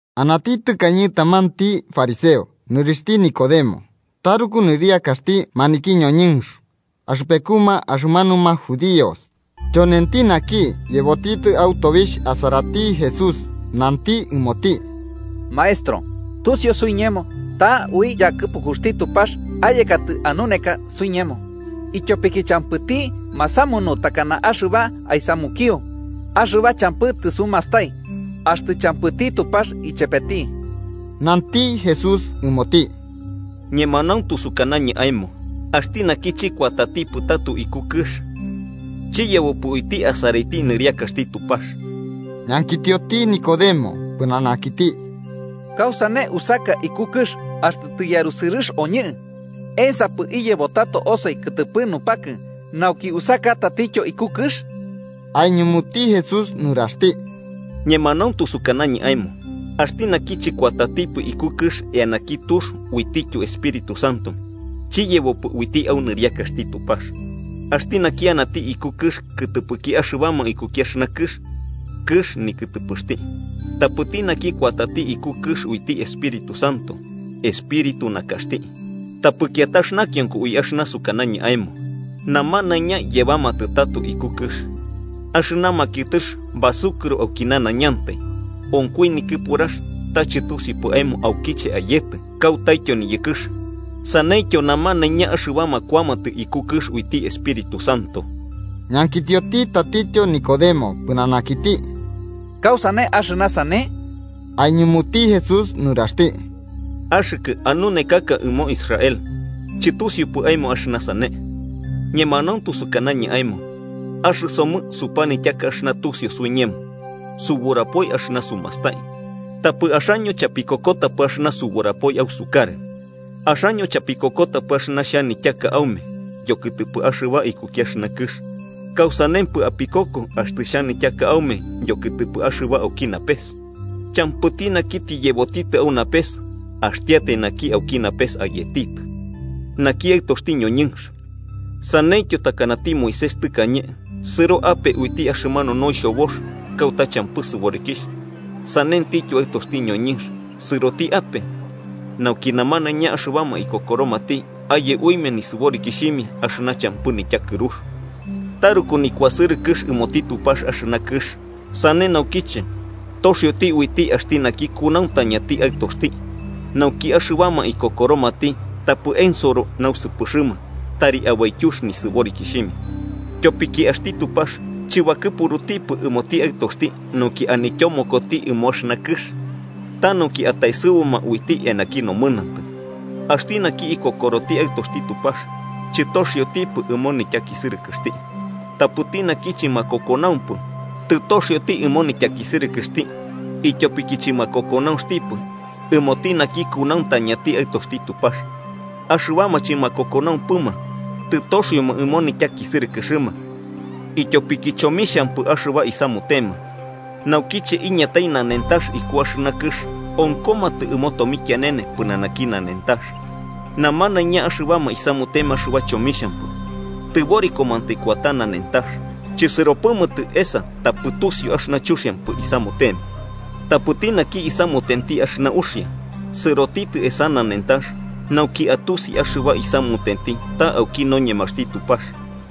Anati tɨkañe tamanti fariseo nɨrixhti Nicodemo, taruku nɨriakaxti maniki ñoñɨnx axɨpekuma axɨmanuma judíos. Tyonenti naki yebotitɨ au tobixh asarati Jesús, nanti ɨmoti: –Maestro, tusiu suiñemo ta ui yakɨpukuxti Tupax ayekatɨ anuneka suiñemo, ityopiki champɨti masamunu takana axɨba aisamukio axɨba champɨ tɨsumastai, axtɨ champɨti Tupax ichepeti. Nanti Jesús ɨmoti: –Ñemanauntu sukañɨ aemo axti naki chɨkuatatipɨ tato iku kɨx, chiyebopɨ uiti asaraiti nɨriakaxti Tupax. Ñankitioti Nicodemo pɨnanakiti: –¿Kausane usaka iku kɨx axtɨ tiyarusɨrɨx oñɨ? ¿Ensapɨ iyebo tato osoi kɨtɨpɨ nupakɨ, nauki usaka tatityo iku kɨx? Aiñumuti Jesús nuraxti: –Ñemanauntu sukanañɨ aemo axti naki chɨkuatatipɨ iku kɨx eanaki tux uitityo Espíritu Santo, chiyebopɨ uiti au nɨriakaxti Tupax. Axti naki anati iku kɨx kɨtɨpɨki axɨbama ikuki axɨna kɨx, kɨx nikɨtɨpɨxti. Tapɨti naki kuatati iku kɨx uiti Espíritu Santo, espíritu nakaxti. Tapɨ kiatax nakionko ui axɨna sukanañɨ aemo: ‘Namanaiña yebamatɨ tato iku kɨx.’ Axɨna makiɨtɨx basukɨro auki nanaiñantai, onkoi nikɨpurax, ta chɨtusiupɨ aemo aukiche ayetɨ, kautaityo niyɨkɨx. Saneityo namanaiña axɨbama kuamatɨ iku kɨx uiti Espíritu Santo. Ñankitioti tatityo Nicodemo pɨnanakiti: –¿Kausane axɨna sane? Aiñumuti Jesús nuraxti: –¿Axɨkɨ, anunekaka ɨmo Israel, chɨtusiupɨ aemo axɨna sane? Ñemanauntu sukanañɨ aemo axɨsomɨ supanityaka axɨna tusiu suiñemo, suburapoi axɨna sumastai. Tapɨ axaño chapikokotapɨ axɨna suburapoi ausukarɨ. Axaño chapikokotapɨ axɨna xhanityaka aume yokɨtɨpɨ axɨba ikuki axɨna kɨx, ¿kausanempɨ apikoko axtɨ xhanityaka aume yokɨtɨpɨ axɨba auki napes? “Champɨti naki tiyebotitɨ au napes axtiatai naki auki napes ayetitɨ. Naki, Aɨtoxti ñoñɨnx. Saneityo takanati Moisés tɨkañe, sɨro ape uiti axɨmanu noixhobox kauta champɨ sɨborikixh, sanentityo Aɨtoxti ñoñɨnx sɨrotitɨ ape, nauki namanaiña axɨbama ikokoromati aye uimia nisɨborikiximia axɨna champɨ nityakɨrux. “Taruku nikuasɨrɨkɨx ɨmoti Tupax axɨna kɨx, sane naukiche toxioti uiti axti naki kunauntañati Aɨtoxti, nauki axɨbama ikokoromati tapɨ ensoro nausɨpɨxɨma, tari abaityux nisɨborikixhimia. Tyopiki axti Tupax chɨbakɨpurutipɨ ɨmoti Aɨtoxti nauki anityomokoti ɨmo axɨna kɨx, ta nauki ataesɨbuma uiti eanaki nomɨnantɨ. “Axti naki ikokoroti Aɨtoxti Tupax, chɨtoxiotipɨ ɨmo nityakisɨrɨkɨxti. Tapɨti naki chɨmakokonaumpɨ, tɨtoxioti ɨmo nityakisɨrɨkɨxti ityopiki chɨmakokonaunxtipɨ ɨmoti naki kunauntañati Aɨtoxti Tupax. Axɨbama chɨmakokonaumpɨma, tɨtoxioma ɨmo nityakisɨrɨkɨxɨma, ityopiki chomixhampɨ axɨba isamutema, naukiche iñatai nanentax iku axɨna kɨx onkomatɨ ɨmo tomikianene pɨnanaki nanentax. Namanaiña axɨbama isamutema axɨba chomixhampɨ, tɨborikomantai kuata nanentax, chɨsɨropɨmatɨ esa tapɨ tusiu axɨna chuxiampɨ isamutema. Tapɨti naki isamutenti axɨna uxia, sɨrotitɨ esa nanentax nauki atusi axɨba isamutenti ta auki noñemaxti Tupax.”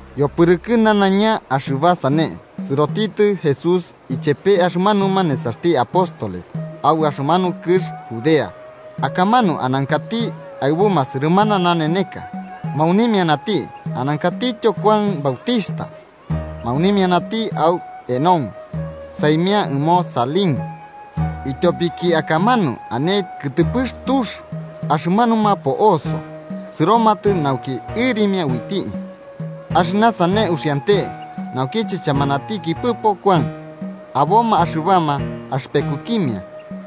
Yopɨrɨkɨ nanaiña axɨba sane, sɨrotitɨ Jesús ichepe axɨmanuma nesaxti apóstoles au axɨmanu kɨx Judea, akamanu anankati aɨbuma sɨrɨmana naneneka, maunimianati. Anankatityo Kuan Bautixhta maunimianati au Enón, saimia ɨmo Salim, ityopiki akamanu ane kɨtɨpɨx tux. Axɨmanuma po'oso sɨromatɨ nauki ɨrimia uiti. Axɨna sane uxiante naukiche chamanatikipɨpo Kuan. Aboma axɨbama axɨpekukimia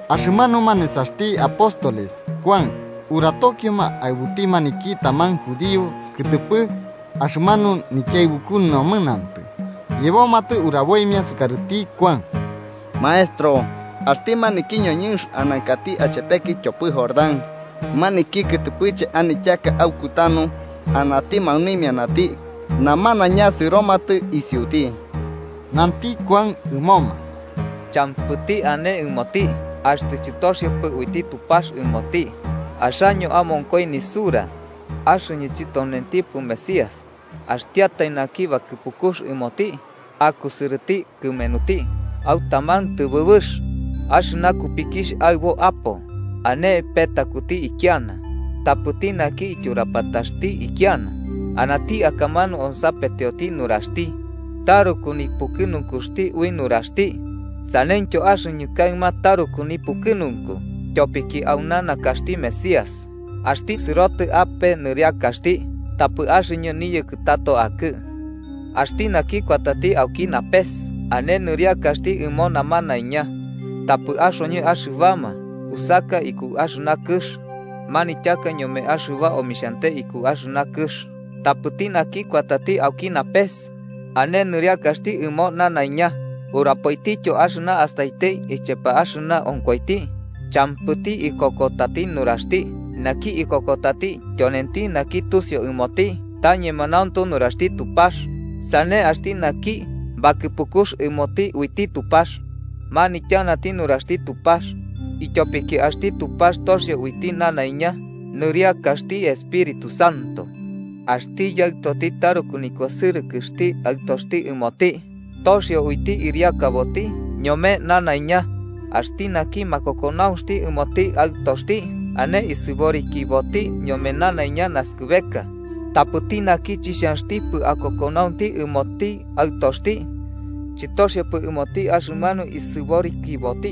axɨmanuma nesaxti apóstoles Kuan uratokioma aɨbuti maniki taman judío kɨtɨpɨ axɨmanu nikiaɨbuku nomɨnantɨ, yebomatɨ uraboimia sukarɨti Kuan: –Maestro, axti maniki ñoñɨnx anankati achepekɨ tyopɨ Jordán, maniki kɨtɨpɨche anityaka aukutanu, anati maunimianati namanaiña sɨromatɨ isiuti. Nanti Kuan ɨmoma: –Champɨti ane ɨmoti axtɨ chɨtoxiopɨ uiti Tupax ɨmoti. Axaño amonkoi nisura axɨñɨ chityonentipɨ Mesías, axtiatai naki bakɨpukux ɨmoti akusɨrɨti kɨmenuti. Au taman tɨbɨbɨx, axɨna kupikixh aɨbo apo ane petakuti kiana. Tapɨti naki ityurapataxti ikiana anati akamanu onsapetioti nuraxti, taruku nipukɨnunkuxti ui nuraxti. Saneityo axɨñɨ kaɨma taruku nipukɨnunku tyopiki auna nakaxti Mesías. Axti sɨrotɨ ape niriakaxti, tapɨ axɨñɨ niyɨkɨ tato akɨ. “Axti naki kuatati auki napes ane nɨriakaxti ɨmo namanaiña. Tapɨ axoñɨ axɨbama usaka iku axɨna kɨx manityaka ñome axɨba omixhante iku axɨna kɨx. Tapɨti naki kuatati auki napes ane nɨriakaxti ɨmo nanaiña, urapoitityo axɨna astaiti ichepe axɨna onkoiti. Champɨti ikokotati nuraxti. Naki ikokotati. Tyonenti naki tusiu ɨmoti ta ñemanauntu nuraxti Tupax. Sane axti naki bakɨpukux ɨmoti uiti Tupax, manityanati nuraxti Tupax, ityopiki axti Tupax toxio uiti nanaiña nɨriakaxti Espíritu Santo. Axti Yaɨtoti taruku nikuasɨrɨkɨxti Aɨtoxti ɨmoti, toxio uiti ɨriakaboti ñome nanaiña. Axti naki makokonaunxti ɨmoti Aɨtoxti, ane isɨborikiboti ñome nanaiña naskɨbeka. Tapɨti naki chixhanxtipɨ akokonaunti ɨmoti Aɨtoxti, chɨtoxiopɨ ɨmoti axɨmanu isɨborikiboti,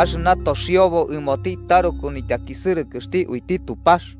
axɨna toxiobo ɨmoti taruku nityakisɨrɨkɨxti uiti Tupax.”